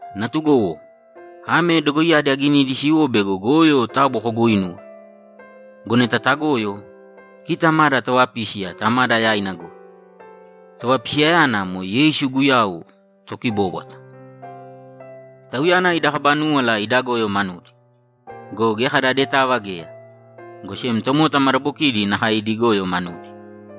Natugowo, ame dogoiyadi aginidi siwo bego goyo taabu koguuinūwe. Go neta tagoyo, kita mada Tovapísiya Tamada yaina goi; Tovapisiyayana moe Yeisu Guyau Tokibóbwata. Tauyana ida kaba núwala ida goyo manudi. Go geya kada adetava geya, go sem tomota madabokidi nakae idi goyo manudi.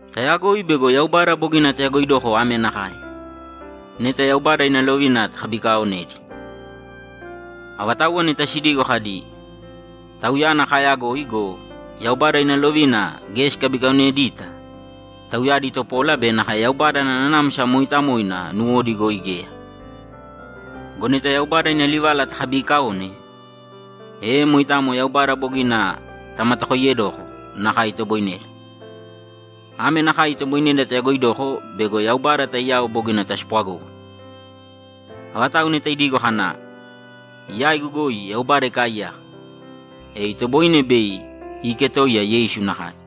Taayagoi bego Yaubada bogina tayagoidoko ame nakae: Neta Yaubada ina lovina takabikaaonedi. Avatauwa neta sidigo kadi, ‘Tauyana kaayagoi’ go, Yaubada ina lovina geya sikabikaonedita, tauyadi topola be nakae Yaubada ana Nanamsa Mooitamoina nuwodi goi geya. Go neta Yaubada ina livala takabiikaone, e moitamo Yaubada bogina tamatakoiyedoko nakae itoboineda. Ame nakae itoboineda tayagoidoko bego Yaubada taiyao bogina taspwagógana: Avatau neta idigo kana, ‘Yaigu goi Yaubada ikaaiyaka’, e itoboine bei iiketoiya Yeisu nakae.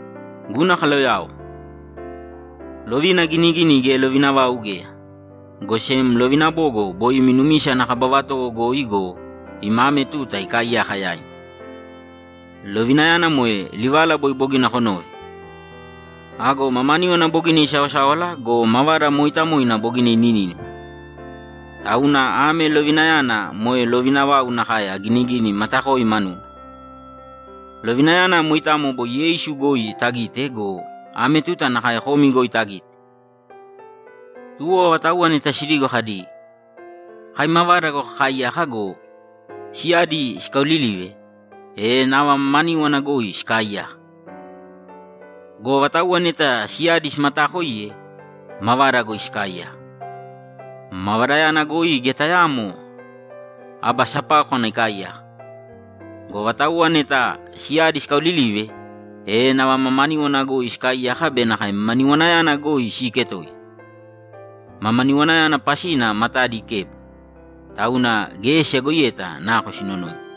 Guna kaloyao, lovina aginigini geya lovina vau geya, go sem lovina bogo boi imi numisa ana kaba vatowo goi go, ima ame tuta ikaaiyaka yaimi. Lovinayana moe livala boi bogina konove. Ago mamaníwana bogina isaosáwala go, mavada mooitamoina bogina ininínima. Tauna ame lovinayana moe lovina vau nakae aginigini matakoi manuna. Lovinayana moitamo boi Yeisu goi tagite go, ame tuta nakae komi goi tagite. Tuwo avatauwa neta sidigo kadi, ‘Kai mavada goi kakaaiyaka’ go, siyadi sikaaolilive, e nava mamaníwana goi sikaaiyaka. Go avatauwa neta siyadi simataakoiye, mavada goi sikaaiyaka. Mavadayana goi geya tayaamo aba sapákwana ikaaiyaka. Go avatauwa neta siyadi sikaaolilive, e nava mamaníwana goi sikaaiyaka be nakae mamaniwanayana goi siiketoiya. Mamaniwanayana pasina matadi ikebo, tauna geya siyagoiyeta nako sinonoina.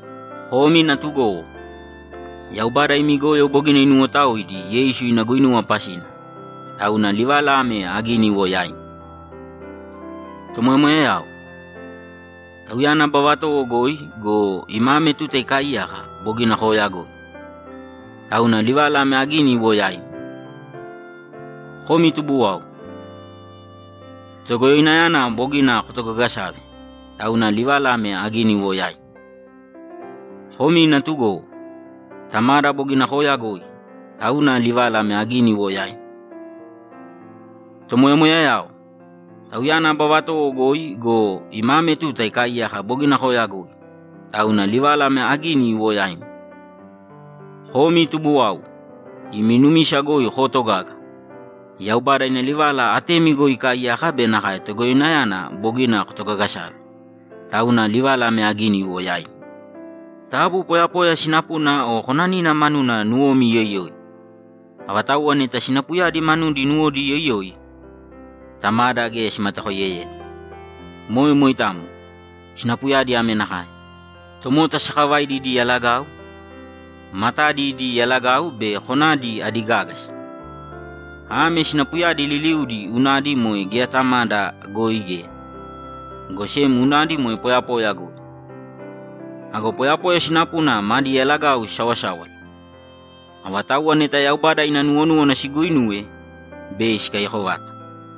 Komi natugowo, Yaubada imi goyo bogina inuwotaoidi Yeisu ina guinuwa pasina, tauna livala ame agini iwo yaimi. Tomoyamoyayao, Tauyana aba vatowo goi go, ima ame tuta ikaaiyaka bogina kooyagoi, tauna livala ame agini iwo yaimi. Komi tubuwau, Togoyoinayana bogina kotogagasave, tauna livala ame agini iwo yaimi. Komi natugowo, Tamada bogina kooyagoi, tauna livala ame agini iwo yaimi. Tomoyamoyayao, Tauyana aba vatowo goi go, ima ame tuta ikaaiyaka bogina kooyagoi, tauna livala ame agini iwo yaimi. Komi tubuwau, Imi numisa goi kootogaga, Yaubada ina livala atemi goi ikaaiyaka be nakae Togoyoinayana bogina kotogagasave, tauna livala ame agini iwo yaimi. Taabu poyapoya sinapuna o konanina manudi nuwomi iyoiyōi. Avatauwa neta sinapuyadi manudi nuwodi iyoiyoi, Tamada geya simatakoiyeyeta. Moe moitamo. Sinapuyadi ame nakae: Tomota sakavaidi idi yalagau, matadi idi yalagau be konadi adi gágasa. Ame sinapuyadi liliudi unadi moe geya Tamada goi geya, go sem unadi moe poyapoya goi. Ago poyapoya sinapuna madi yalagau sisaosáwala. Avatauwa neta Yaubada ina nuwonúwana siguuinuwe, bei sikaiyako vata.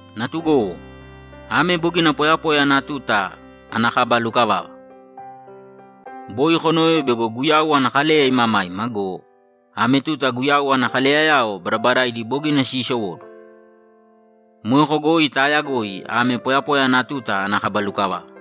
Natugowo, ame bogina poyapoya ana tuta ana kaba lukavava. Boi konove bego Guyau ana kaleya imamaima go, ame tuta Guyau ana kaleyayao badabadaidi bogina siisowóduwo. Moeko goi taayagoi ame poyapoya ana tuta ana kaba lukavava.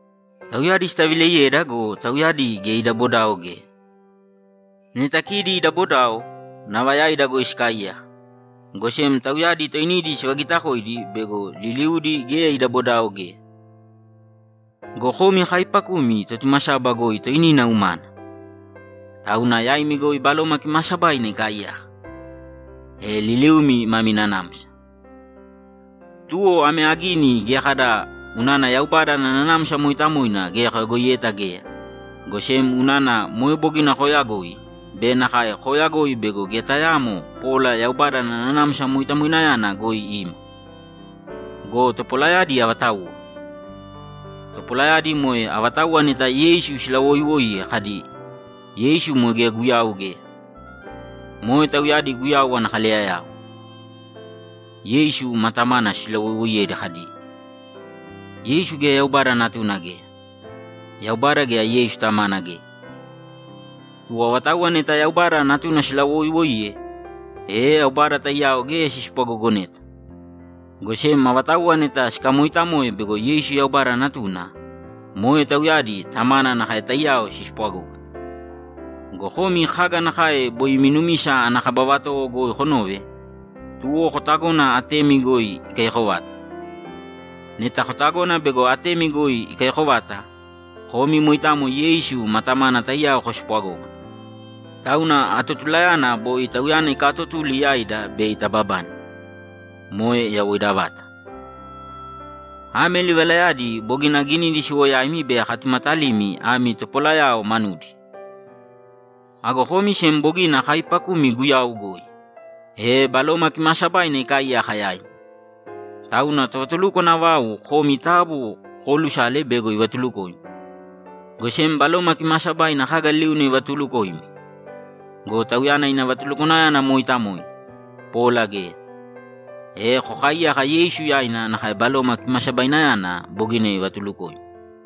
Tauyadi sitavileiyeda go, tauyadi geya ida bodao geya. Neta kidi ida bodao, nava yaida goi sikaaiyaka, go sem tauyadi toinidi sivagitakoidi bego liliudi geya ida bodao geya. Go komi kaaipakumi Totumasaba goi toinina umana, tauna yaimi goi Baloma Kimaasabaina ikaaiyaka, e liliumi mami nanamsa. Tuwo ame agini geya kada unana Yaubada ana Nanamsa Mooitamoina geya koyagoiyeta geya, go sem unana moe bogina kooyagoi be nakae kooyagoi bego geya tayaamo pola Yaubada ana Nanamsa Moitamoinayana goi ima. Go topolayadi avatauwa? Topolayadi moe avatauwa neta Yeisu silawoiwoiye kadi, ‘Yeisu moe geya Guyau geya.’ Moe tauyadi Guyau ana kaleyayao. Yeisu ma Tamana silawoiwoiyedi kadi, ‘Yeisu geya Yaubada Natuna geya. Yaubada geya Yeisu Tamana geya.’ Tuwo avatauwa neta Yaubada Natuna silawoiiwoiye, e Yaubada taiyao geya sispwagogoneta, go sem avatauwa neta sikamooitamo bego Yeisu Yaubada Natuna, moe tauyadi Tamana nakae taiyao sispwagógana. Go komi kaga nakae boi imi numisa ana kaba vatowo goi konove, tuwo kotagōna atemi goi ikaiyako vata. Neta kotagona bego atemi goi ikaiyako vata, komi moitamo Yeisu ma Tamana taiyao kospwagógana. Tauna atotulayana boi Tauyana ikaatotuli yaida bei tababane, moe yawoida vata. Ame livalayadi bogina aginidi siwo yaimi bei akatumatalimi ami topolayao manudi. Ago komi sem bogina kaaipakumi Guyau goi, e Baloma Kimaasabaina ikaaiyaka yaimi. Tauna tovatulukwana vau komi taabu koolusāle bego ivatulukoimi, go sem Baloma Kimaasabaina kaga liliuna ivatulukoimi. Go Tauyana ina vatulukwanayana moitamo, pola geya. E kokaaiyāka Yeisu yaina nakae Baloma Kimasabainayana bogina ivatulukoimi.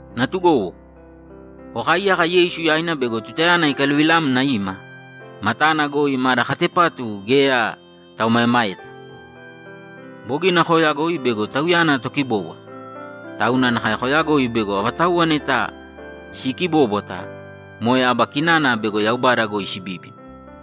Natugowo, kokaaiyāka Yeisu yaina bego tutayana ikaluvilamna ima, matana goi mada katepatu geya taomaemaeta. Bogina kooyagoi bego Tauyana Tokibóbwata, tauna nakae koyagoi bego avatauwa neta siikibóbwata, moe aba kinana bego Yaubada goi sibíbina.